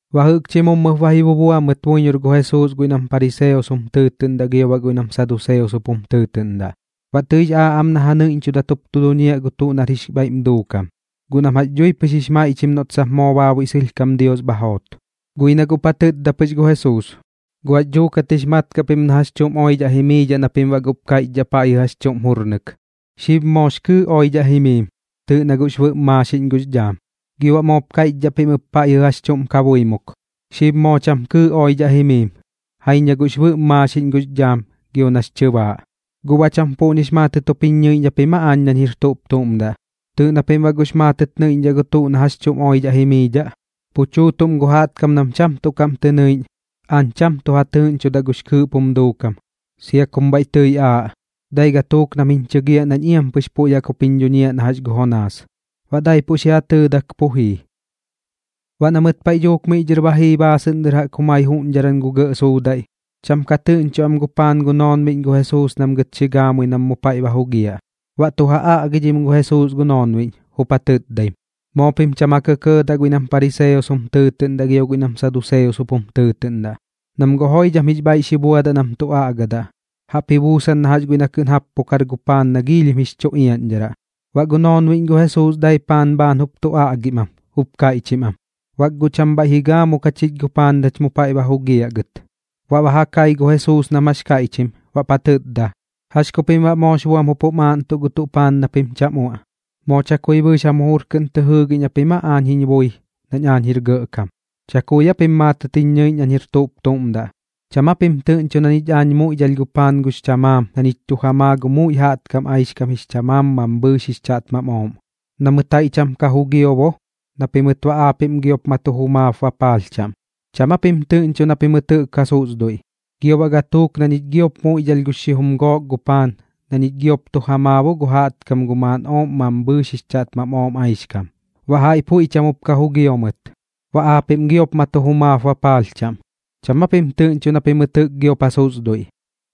Baꞌ jɨꞌkchi mummɨp ba ji bubua mɨt buiñor gu Jesuus guiꞌ nam pariseos jum tɨɨtɨꞌndaꞌ gio baꞌ guiꞌ nam saduseos jup jum tɨɨtɨꞌndaꞌ. Baꞌ tɨi bax aaꞌ am na ja nɨiꞌñchudat jup duñiaꞌ gɨt gu tuꞌ nar jix bhaiꞌm duukam, guꞌ nam jax dhui pɨx jix maiꞌchim noꞌt sap moo baabuiꞌ sɨlhkam Dios bha joot. Guꞌ ji na guꞌp ja tɨtda pɨx gu Jesuus: ―¿Guꞌ jax dhuukat jix mat kaꞌ pim na jax chuꞌm oidhaꞌ jimiidhaꞌ na pim baꞌ guꞌp kaiꞌchdhaꞌ paiꞌjɨ jax chuꞌm jurnɨk: “Xib moox kɨɨꞌ oidhaꞌ jimiim, tɨɨꞌ na guꞌx bɨꞌm maaxiꞌñ gux dhaam”? Gio baꞌ moop kaiꞌchdhaꞌ pim ɨp paiꞌjɨ jax chuꞌm kabuimuk: “Xib moo cham kɨɨꞌ oidhaꞌ jimiim. Jaiñ na guꞌx bɨꞌm maaxiꞌñ gux dhaam gio nax chɨbaaꞌ.” ¿Guꞌ baꞌ cham puꞌñix maatɨt jup jiñ ñɨiꞌñ japim aa aañ nañ jir tuꞌp tuꞌm daꞌ? Tɨɨꞌ na pim baꞌ guꞌx maatɨt nɨiꞌñdhaꞌ gu tuꞌ na jax chuꞌm oidhaꞌ jimiidhaꞌ. Pu chuutuꞌm gu jaꞌtkam nam cham tuꞌ kaꞌm tɨ nɨiꞌñ, aañ cham tuꞌ ja tɨɨꞌñchudaꞌ gux kɨɨꞌp jum duukam, sia kum bhaiꞌ tɨi aaꞌ. Dai gatuuk nam jiñ chɨgiaꞌ nañ iampɨx puiꞌ jaꞌk jup jiñ dhuñiaꞌ na jax gu Jonaas. Baꞌ daipuꞌ xi ja tɨɨdak pu jii. Baꞌ na mɨt paiꞌ dhuuk miꞌ dhɨr ba jii baasɨꞌn dɨr jaꞌk jumai juꞌñdharan gu gɇꞌ suudaiꞌ, cham ka tɨꞌñcho am gu paan gu noonbiꞌñ gu Jesuus nam gɨt xi gaamui nam mu paiꞌ ba jugiaꞌ. Baꞌ tu ja aꞌgidhim gu Jesuus gu noonbiꞌñ, jup ja tɨtdaim: ―Moo pim cham ja kɇkɇɇdaꞌ guiꞌ nam pariseos jum tɨɨtɨꞌndaꞌ gio guiꞌ nam saduseos jup jum tɨɨtɨꞌndaꞌ, nam guꞌ joidham jix bhaiꞌ xi buadaꞌ nam tu aꞌgadaꞌ, jaꞌp ji buusan na jax guiꞌ na kɨꞌn jappukar gu paan na giilhim jix chu iaꞌñdharaꞌ. Baꞌ gu noonbiꞌñ gu Jesuus dai paan bhaan jup tu aꞌgim am, jup kaiꞌchim am: ―Bak guꞌ cham bhaiꞌ xi gaamuk jachich gu paan nach mu paiꞌ ba jugiaꞌ gɨt. Baꞌ ba ja kai gu Jesuus nam jax kaiꞌchim, baꞌp ja tɨtda: ―¿Jax ku pim baꞌ moox buam jup bam aaꞌntuꞌ gu tuꞌ paan na pim cham uaꞌ? ¿Moo chakui bɨɨx jam jujur kɨꞌn tɨ jɨɨgiꞌñ japim aa aañ jiñ bui nañ aañ jir gɇꞌkam? ¿Chakui aa pim maatɨt jiñ ñɨiꞌñ nañ jir tuꞌp tuꞌm daꞌ? ¿Cham aa pim tɨꞌñcho na ñich aañ muiꞌdhalh gu paan gux chamaam na ñich tu ja maa gu muiꞌ jaꞌtkam aixkam jix chamaam mambhɨɨx jix chaꞌtmam ooꞌm? Na mɨt jaiꞌ cham ka jugio bo na pimɨt baꞌ aapiꞌm giop ma tu jumaap bapaalh chaꞌm. ¿Cham aa pim tɨꞌñcho na pimɨt jɨꞌk ja susduiꞌ? Gio baꞌ gatuuk na ñich giop muiꞌdhalh gu xijum gook gu paan na ñich giop tu ja maa bo gu jaꞌtkam gu maakob mambhɨɨx jix chaꞌtmam ooꞌm aixkam, baꞌ jaiꞌ puiꞌ cham jup ka jugio mɨt, baꞌ aapiꞌm giop ma tu jumaap bapaalh chaꞌm. ¿Cham aa pim tɨꞌñcho na pimɨt jɨꞌk giop ja susduiꞌ?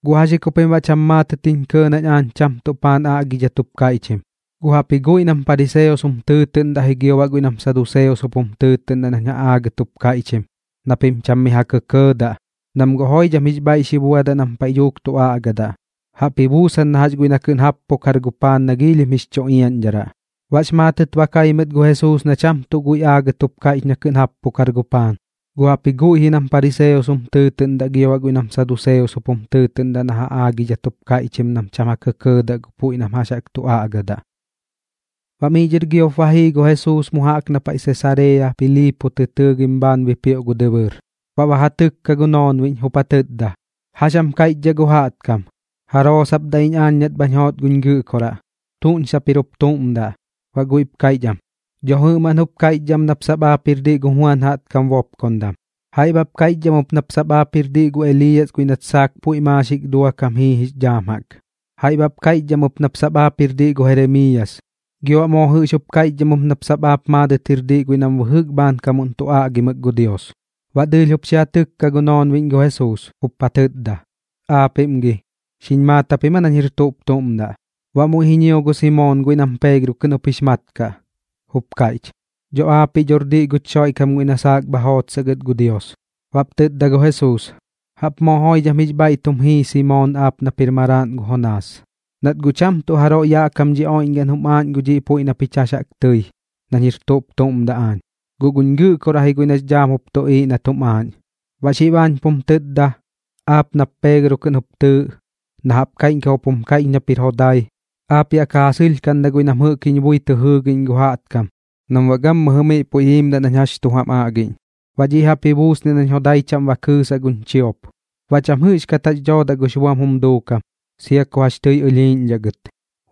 ¿Guꞌ jax ji ku pim baꞌ cham maatɨt jiñ kɇɇ nañ aañ cham tuꞌ paan aagidhat jup kaiꞌchim? Guꞌ jaꞌpji guiꞌ nam pariseos jum tɨɨtɨꞌndaꞌ ji gio baꞌ guiꞌ nam saduseos jup jum tɨɨtɨꞌndaꞌ nañ ja aagɨt jup kaiꞌchim na pim cham mi ja kɇkɇɇdaꞌ, nam guꞌ joidham jix bhaiꞌ xi buadaꞌ nam paiꞌ dhuuk tu aꞌgadaꞌ, jaꞌp ji buusan na jax guiꞌ na kɨꞌn jappukar gu paan na giilhim jix chu iaꞌñdharaꞌ. Baꞌx maatɨt ba kai mɨt gu Jesuus na cham tuꞌ guiꞌ aagɨt jup kaiꞌch na kɨꞌn jappukar gu paan, guꞌ jaꞌpji guiꞌ ji nam pariseos jum tɨɨtɨꞌndaꞌ gio baꞌ guiꞌ nam saduseos jup jum tɨɨtɨꞌndaꞌ na ja aagidhat jup kaiꞌchim nam cham ja kɇkɇɇdaꞌ gu puiꞌ nam jax jaꞌk tu aꞌgadaꞌ. Baꞌ miꞌ dhɨr giop ba jii gu Jesuus mu jaꞌk na paiꞌ Sesarea Piliipo tɨ tɨɨgim bhaan bipioꞌ gu dɨbɨɨr. Baꞌ ba ja tɨkka gu noonbiꞌñ, jup ja tɨtda: ―¿Jax jam kaiꞌchdhaꞌ gu jaꞌtkam? ¿Jaroo sap daꞌ iñ aañ nat bhañ joot guñ Gɨꞌkoraꞌ? ¿Tuꞌñ sap jir jup tuꞌm daꞌ? Baꞌ guiꞌp kaiꞌch am: ―Dho jɨꞌmaꞌn jup kaiꞌchdhaꞌ am nap sap aap jir diꞌ gu Juan jaꞌtkam bopkondam. Jaiꞌ baꞌp kaiꞌchdhaꞌ am ɨp nap sap aap jir diꞌ gu Eliiyas guiꞌ nat saak puiꞌ maaxik duakam jii jix dhaam jaꞌk. Jaiꞌp baꞌp kaiꞌchdhaꞌ am ɨp nap sap aap jir diꞌ gu Jeremiiyas, gio baꞌ moo jɨꞌx jup kaiꞌchdhaꞌ am ɨp nap sap aap maadɨt jir diꞌ guiꞌ nam bɨjɨk bhaankam tu aꞌgimɨk gu Dios. Baꞌ dɨɨlh jup xi ja tɨkka gu noonbiꞌñ gu Jesuus, jup ja tɨtda: ―¿Aapiꞌm gi, xiñ maat japim aa nañ jir tuꞌp tuꞌm daꞌ? Baꞌ muiꞌ ji ñio gu Simoon guiꞌ nam Peegro kɨꞌn jup jix mat kaꞌ, jup kaiꞌch: ―Dho aapiꞌ dhor diꞌ guch Xoiꞌkam guiꞌ na saak bha jootsaꞌ gɨt gu Dios. Baꞌp tɨtda gu Jesuus: ―Jaꞌp moo joidham jix bhaiꞌ tum jii Simoon aap nap jir maraaꞌn gu Jonaas, nat guꞌ cham tuꞌ jaroiꞌ yaꞌ kam dhi oiꞌñgaꞌn jum aaꞌñ gu dhiꞌ puiꞌ na pich jax jaꞌk tɨi nañ jir tuꞌp tuꞌm daꞌ aañ, guꞌ guñ Gɨꞌkoraꞌ ji guiꞌ nax dhaam jup tuꞌiiꞌ nat jum aaꞌñ. Baꞌ xib aañ pum tɨtda, aap nap Peegro kɨꞌn jup tɨɨꞌ, na jaꞌp kaiꞌñkam jup jum kaiꞌch nap jir jodai, aap yaꞌ ka ja sɨlhkaꞌndaꞌ guiꞌ nam jɨꞌk jiñ bui tɨ jɨɨgiꞌñ gu jaꞌtkam nam baꞌ gammɨjɨ miꞌ puiꞌ jiimdaꞌ nañ jax tu jam aꞌgiꞌñ. Baꞌ dhiꞌ jaꞌp ji buusniaꞌ nañ jodai chaꞌm ba kɨɨsaꞌ guñ chiop. Baꞌ cham jɨꞌxkat jax dhoodaꞌ gux buam jum duukam, sia ku jax tɨi ɨlhiiꞌñdhaꞌ gɨt.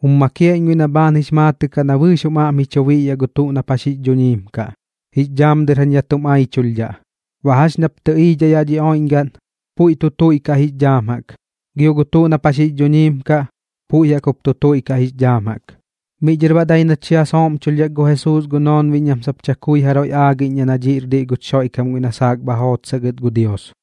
Jum makiaꞌ iñ guiꞌ na bhaan jix maatɨꞌ kaꞌ na bɨɨx jum aꞌm ji chu biꞌyaꞌ gu tuꞌ nap jax jix dhuñiim kaꞌ, jix dhaam dɨr jañ yaꞌ tum aichulhdhaꞌ. Baꞌ jax ñap tɨꞌiidhaꞌ yaꞌ dhi oiꞌñgaꞌn, puiꞌp tu tuiꞌkaꞌ jix dhaam jaꞌk, gio gu tuꞌ nap jax jix dhuñiim kaꞌ, puiꞌ jaꞌk jup tu tuiꞌkaꞌ jix dhaam jaꞌk. Miꞌ dhɨr baꞌ dai nat xi ja sooꞌmchulhdhak gu Jesuus gu noonbiꞌñ nam sap chakui jaroiꞌ aagiꞌñdhaꞌ na dhiꞌr diꞌ guch Xoiꞌkam guiꞌ na saak bha jootsaꞌ gɨt gu Dios.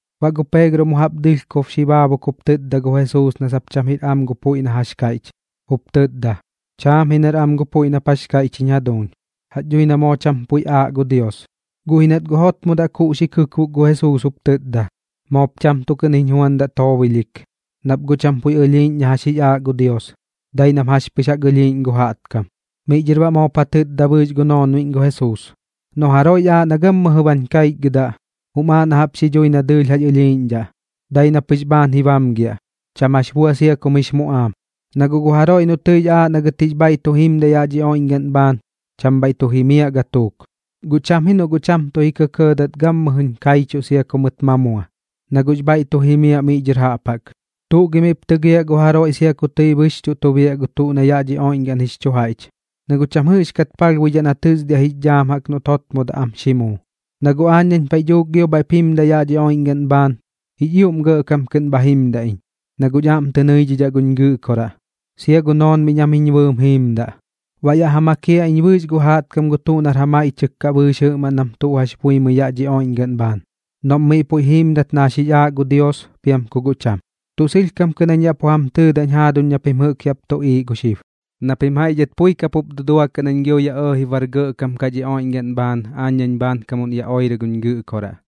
Baꞌ gu Peegro mu jaꞌp dɨlhkob xi baakuk jup tɨtda gu Jesuus na sap cham jir am gu puiꞌ na jax kaiꞌch, jup tɨtda: ―Chaam ji nar am gu puiꞌ nap jax kaiꞌch jiñ jaduuñ. Jax dhui na moo cham puiꞌ aaꞌ gu Dios. Guꞌ ji nat guꞌ jotmodaꞌ kuꞌ xi kɨkbok gu Jesuus jup tɨtda: ―Moop cham tuꞌ kɨꞌn jiñ juandaꞌ toobilhik, nap guꞌ cham puiꞌ ɨlhiiꞌñ na jax jix aaꞌ gu Dios, dai nam jax pɨx jaꞌk ɨlhiiꞌñ gu jaꞌtkam. Miꞌ dhɨr baꞌ moop ja tɨtda bɨɨx gu noonbiꞌñ gu Jesuus: ―Noꞌ jaroiꞌx aaꞌ na gammɨjɨ bañ kaichgɨdaꞌ, jum aaꞌ na jaꞌp xi dhuuji na dɨɨlh jax ɨlhiiꞌñdhaꞌ, dai na pɨx bhaan ji bamgiaꞌ, cham jax bua sia kum jix muꞌaam. Na guꞌ gu jaroiꞌ noꞌ tɨix aaꞌ na gɨt jix bhaiꞌ tu jimdaꞌ yaꞌ dhi oiꞌñgaꞌn bhaan, cham bhaiꞌ tu jimiaꞌ gatuuk. Guꞌ cham ji noꞌ guꞌ cham tuꞌ ji kɇkɇɇdat gammɨjɨñ kaichuꞌ sia ku mɨt ma mua, na guꞌx bhaiꞌ tu jimiaꞌ miꞌ dhɨr jaꞌp jaꞌk. ¿Tuꞌ gi miꞌp tɨgiaꞌ gu jaroiꞌ sia ku tɨi bɨxchuꞌ tu biaꞌ gu tuꞌ na yaꞌ dhi oiꞌñgaꞌn jix chu jaiꞌch? Na guꞌ cham jɨꞌxkat palhbuidhaꞌ na tɨsdiaꞌ jix dhaam jaꞌk noꞌt jotmodaꞌ am xi muu. Na guꞌ aañ nañ paiꞌ dhuuk gio bhaiꞌp jimdaꞌ yaꞌ dhi oiꞌñgaꞌn bhaan, jix ioꞌm gɇꞌkam kɨꞌn bha jimdaꞌ iñ, na guꞌñ aꞌm tɨ nɨidhidhaꞌ guñ Gɨꞌkoraꞌ, sia gu noonbiꞌñ jam jiñ bɨɨm jiimdaꞌ. Baꞌ yaꞌ ja makiaꞌ iñ bɨɨx gu jaꞌtkam gu tuꞌ nar ja maiꞌchɨk kaꞌ bɨɨx jɨꞌmaꞌn nam tuꞌ jax buimɨi yaꞌ dhi oiꞌñgaꞌn bhaan, noꞌm miꞌ puiꞌ jiimdat na jax jix aaꞌ gu Dios piam ku guꞌ cham. Tuꞌ sɨlhkam kɨꞌn jañ yaꞌ pu jam tɨtdañ jaaduñ na pim jɨꞌk yaꞌp tuꞌiiꞌ gu xib, na pim jaiꞌ dhɨt pui kapup duduakaꞌ nañ gio yaꞌ ɇɇji bar gɇꞌkam kaꞌ dhi oiꞌñgaꞌn bhaan, aañ nañ bhaankam yaꞌ oirɨ guñ Gɨꞌkoraꞌ.